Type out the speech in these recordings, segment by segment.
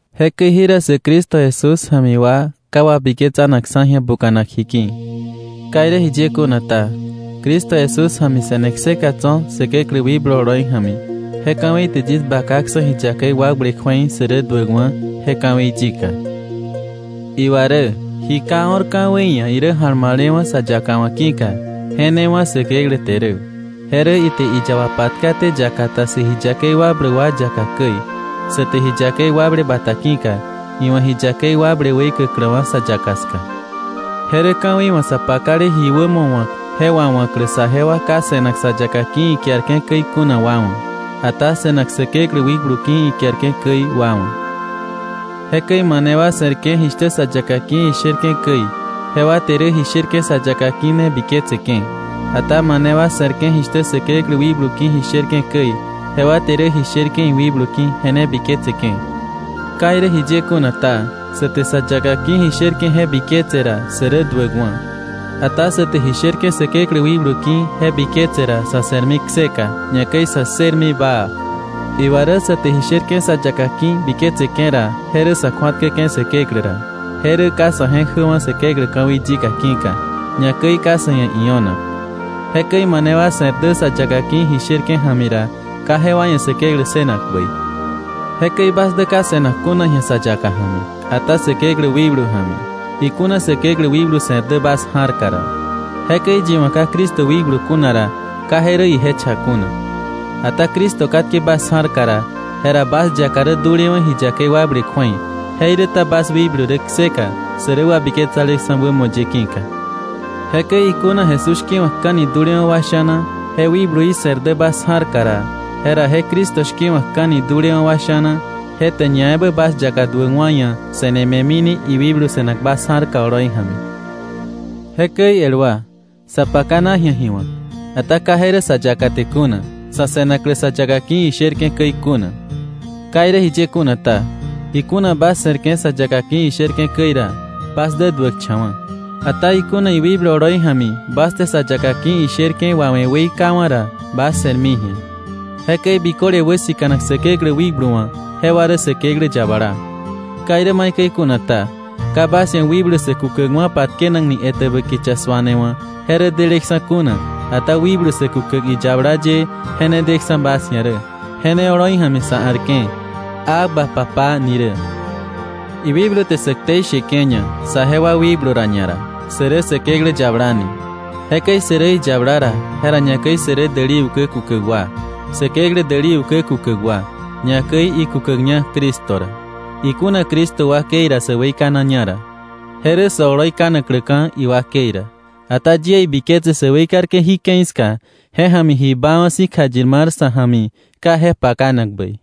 Jekäi jira sä Cristo Jesús ja̱mi wa, ka wabiketsanakksa̱ ji̱a buka̱nak ji ki̱. Ka irä jiye kuna ta, Cristo Jesús ja̱mi se̱ne kseka tso̱ Säkeklä wikblu oloi ja̱mi, je ka̱wei te yis bakaksa̱ ji yakei wakble kju̱ei sä rä duäkwa̱, je ka̱wei yika. Iwa rä ji ka o̱r ka̱wei ia̱ irä ja̱lma̱lewa̱ sa yaka wa̱ ki̱ka, je ne wá̱ Säkeklä te rä. Je rä ite iyaba patkaté yaka ta sä ji yakei wakbläk wa yaka käi, sa te ji yakei wakble bata ki̱ka, iwa̱ ji yakei wakble weikäkläwa̱ sa yaka ska. Je rä ka̱wei wa̱ sa pakale ji wämo wa̱k je wawa̱klä saje wa ka se̱nak sa yaka ki̱ ikiarke̱ käi kuna wa wa̱, ata se̱nak Säkeklä wikblu ki̱ ikiarke̱ käi wa wa̱. Jekäi mane wa se̱rke̱ jishtä sa yaka ki̱ isherke̱ käi, jewa te rä ji sherke̱ sa yaka ki̱ ne biketseke̱. Ata mane wa se̱rke̱ jishtä Säkeklä wikblu ki̱ ji sherke̱ käi, jewa te rä ji sherke̱ iwikblu ki̱ je ne biketseke̱. Ka irä jiye kuna ta, sa te sa yaka ki̱ ji sherke̱ je biketse ra sä rä duäkwa̱. Ata sa te ji sherke̱ Säkeklä wikblu ki̱ je biketse ra sa̱ se̱rmi kseka, ñakäi sä ssërmi baa. Iwa rä sa te ji sherke̱ sa yaka ki̱ biketseke̱ ra, je rä sa̱ kju̱atkäke̱ Säkeklä ra. Je rä ka sa̱ je̱k jäwa̱ Säkeklä ka̱wei yika ki̱ka, ñakäi ka sa̱ ia̱ io̱nak. Jekäi mane wa se̱r dä sa yaka ki̱ ji sherke̱ ja̱mi ra, ka jewa ia̱ Säkeklä ssënak bäi. Jekäi bas dä ka se̱nak kuna ji̱a sa yaka ja̱mi, ata Säkeklä wikblu ja̱mi, ikuna Säkeklä wikblu se̱r dä bas ja̱rka ra. Jekäi yi wa̱ ka Cristo wikblu kuna ra, ka je rä ije cha kuna. Ata Cristo katke bas ja̱rka ra, jera bas yaka rä dulewa̱ ji yakei wakble kju̱ei, jeiräta bas wikblu rä kseka sä rä wabiketsaleksa̱ wämo ye ki̱ka. Jekäi ikuna Jesús shki̱wa̱kka̱ni dulewa̱ wa sha̱na je wikbluí se̱r dä bas ja̱rka ra, jera je Cristo shki̱wa̱kka̱ni dulewa̱ wa sha̱na je te ñaebä bas yaka duäkwa̱ ia̱ se̱ne me̱mini iwikblu se̱nak bas ja̱rka oloi ja̱mi. Jekäi el wa, sa pakana ji̱a ji wa̱k, ata ka je rä sa yaka te kuna, sa̱ se̱naklä sa yaka ki̱ isherke̱ käi kuna. Ka irä jiye kuna ta, ikuna bas se̱rke̱ sa yaka ki̱ isherke̱ käi ra, bas dä duäkcha̱wa̱. Ata ikuna iwikblu oloi ja̱mi bas te sa yaka ki̱ isherke̱ wawe̱ weikawa̱ ra, bas se̱rmi ji̱a. Jekäi biköle wäsika̱nak Säkeklä wikblu wa̱, jewa rä Säkeklä yabala. Ka irä maikäi kuna ta, ka bas ia̱ wikblu sä kukäkwa̱ patkenakni etäbä kicha suane wa̱ je rä deleksa̱ kuna, ata wikblu sä kukäk iyabala ye je ne deksa̱ bas ia̱ rä, je ne oloi ja̱mi sa a̱rke̱: “¡Abba, Papá” ni rä! Iwikblu te sä ktei sheke̱ña saje wa wikblu ra ñara, sä rä Säkeklä yabala ni. Jekäi sä rä iyabala ra, jera ñakäi sä rä däli ukä kukäk wa, Säkeklä däli ukä kukäk wa, ñakäi ikukäkña Cristo ra, ikuna Cristo wakei ra sä weikanaña ra. Je rä sä oloi kanakläka̱ iwakei ra. Ata yie ibiketse sä weikarke̱ jí ke̱i ska je ja̱mi ji baawa̱ si̱ kjayir mar sa̱ ja̱mi ka je pakanak bäi.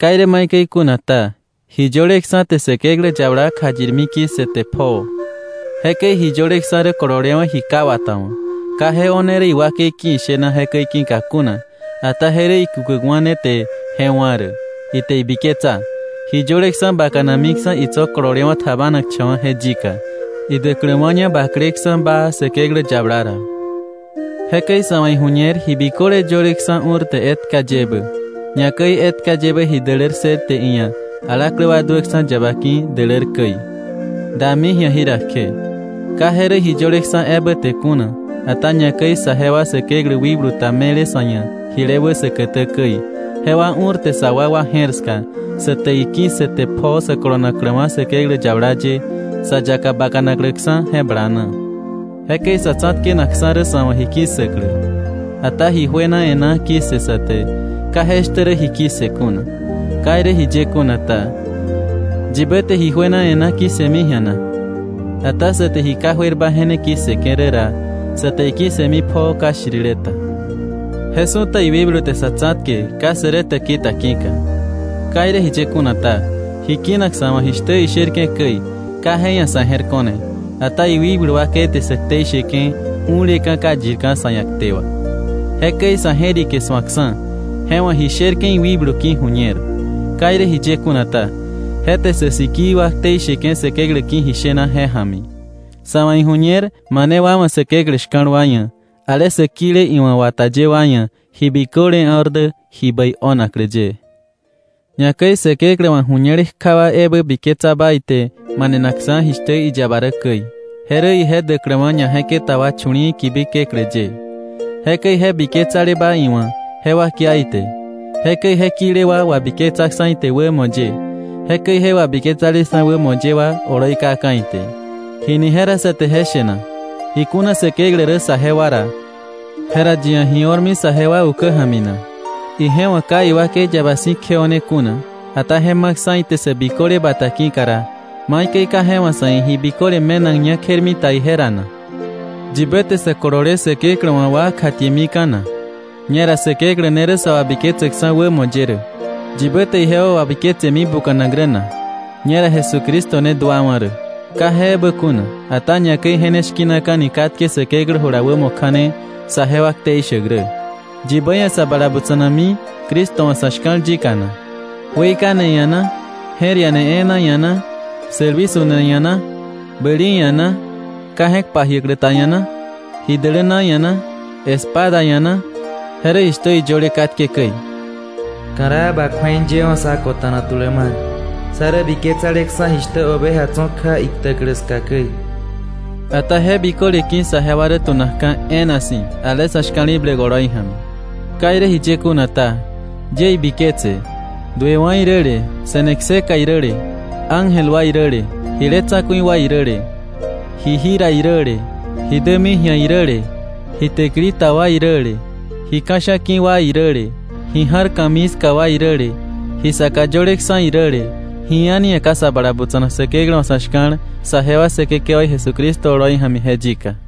Ka irä maikäi kuna ta, ji yöleksa̱ te Säkeklä yabala kjayirmi ki̱ssëte pjoo. Jekäi ji yöleksa̱ rä kololewa̱ ji ka wata wa̱, ka je o̱ne rä iwakei ki̱ ishena jekäi ki̱ka kuna, ata je rä ikukäkwa̱ ne te je wá̱ rä, ite ibiketsa ji yöleksa̱ bakanamiksa̱ itso̱ kololewa̱ tjabanakcha̱wa̱ je yika, idäkläwa̱ña bakleksa̱ baa Säkeklä yabala ra. Jekäi sa̱ wa̱ iju̱ñer ji biköle yöleksa̱ u̱rte etka yebä, ñakäi etka yebä ji dälär ssërte iia̱ alaklä wa duäksa̱ yaba ki̱ dälär käi, dami ji̱a jira kje. Ka je rä ji yöleksa̱ ebä te kuna. Ata ñakäi saje wa Säkeklä wikblu ta me̱le sa̱ ia̱ jile wä säkätä käi, jewa u̱rte sa wakwa je̱r ska, sa te iki̱ssëte pjoo sä kolonakläwa̱ Säkeklä yabala ye, sa yaka bakanakläksa̱ je bala na. Jekäi sa̱ tsa̱tkenaksa̱ rä sa̱ wa̱ ji ki̱ssäklä. Ata ji juena e̱ná ki̱ssë sa te, ka je shtä rä ji ki̱ssë kuna. Ka irä jiye kuna ta, ¿yibä te ji juena e̱ná ki̱ssëmi ji̱a na? Ata sä te ji ka juerba je ne ki̱ssëke̱ rä ra, sa te iki̱ssëmi pjoo ka shtirile ta. Je su̱ta iwikblu te sa̱ tsa̱tke ka sä rä täki ta ki̱ka. Ka irä jiye kuna ta, ji kinak sa̱ wa̱ jishtä isherke̱ käi, ka je ia̱ sa̱ je̱r ko̱ne. Ata iwikblu wakei te sä ktei sheke̱ u̱leka̱ ka yirka̱ sa̱ ia̱ kte wà. Jekäi sa̱ je̱rike su̱akksa̱, je wa̱ ji sherke̱ iwikblu ki̱ ju̱ñer. Ka irä jiye kuna ta, je te sä sikii wa ktei sheke̱ Säkeklä ki̱ ji shena je ja̱mi. Sa̱ wa̱ iju̱ñer mane wa wa̱ Säkeklä shka̱l wa ia̱, ale sä kile iwa̱ wata ye wa ia̱, ji biköle o̱r dä ji bäi o̱naklä ye. Ñakäi Säkeklä wa̱ ju̱ñele kja wa ebä biketsaba ite manenaksa̱ jishtä iyaba rä käi. Je rä ije däkläwa̱ ñaje̱keta wa chu̱li̱i̱ kibi keklä ye. Jekäi je biketsaleba iwa̱, jewa kia ite. Jekäi je kile wa wabiketsaksa̱ ite wämo ye; jekäi je wabiketsaleksa̱ wämo ye wa oloi kaka̱ ite. ¿Jini jera sa te je she na? Ikuna Säkeklä rä saje wa ra, jera ¿yi ia̱ ji o̱rmi saje wa ukä ja̱mi na? Ije wa̱ ka iwakei yaba si̱ kjeo̱ne kuna, ata je ma̱ksa̱ ite sä biköle bata ki̱ka ra, ¿maikäi ka je wa̱ sa̱ ia̱ ji biköle me̱nakña kjermita ije ra na? ¿Yibä te sä kolole Säkeklä wa̱ wa kjatiemika̱ na? Ñera Säkeklä ne rä sa wabiketsäkksa̱ wämo ye rä. ¿Yibä te ijewa wabiketsemi buka̱nak rä na? Ñera Jesucristo ne duawa̱ rä. Ka je ebä kuna, ata ñakäi je ne shki̱naka̱ni katke Säkeklä jula wämo kja̱ne saje wa ktei shäk rä. ¿Yibä ia̱ sa bala butsa̱nakmi Cristo wa̱ sa̱ shka̱l yika na? ¿Weikane ia̱ na, je̱r iane e̱e̱na ia̱ na, sälwi su̱ne ia̱ na, bäli ia̱ na, ka je̱k pajiäklä ta ia̱ na, ji däläna ia̱ na, espada ia̱ na? Je rä jishtä iyöle katke käi: “Ka̱raa ba kju̱ei yewa̱ sá kota̱na tulä mar; sá rä biketsa̱leksa̱ jishtä oveja tso̱ kja iktäklä ska käi.” Ata je biköle ki̱ saje wa rä tu̱nakka̱ e̱e̱na si̱, ale sa̱ shka̱li̱bläk oloi ja̱mi. Ka irä jiye kuna ta, yie ibiketse, duewa̱ iräle, se̱ne kseka iräle, ángel wa iräle, jile tsa̱ku̱i wa iräle, ji jira iräle, ji dämi ji̱a iräle, ji täkili ta wa iräle, ji ka̱sha̱a̱ ki̱ wa iräle, ji ja̱r ka̱mii ska wa iräle, ji saka yöleksa̱ iräle, ji a̱ni ia̱ ka sa bala butsa̱nak Säkeklä wa̱ sa̱ shka̱l saje wa Säkekewaí Jesucristo oloi ja̱mi je yika.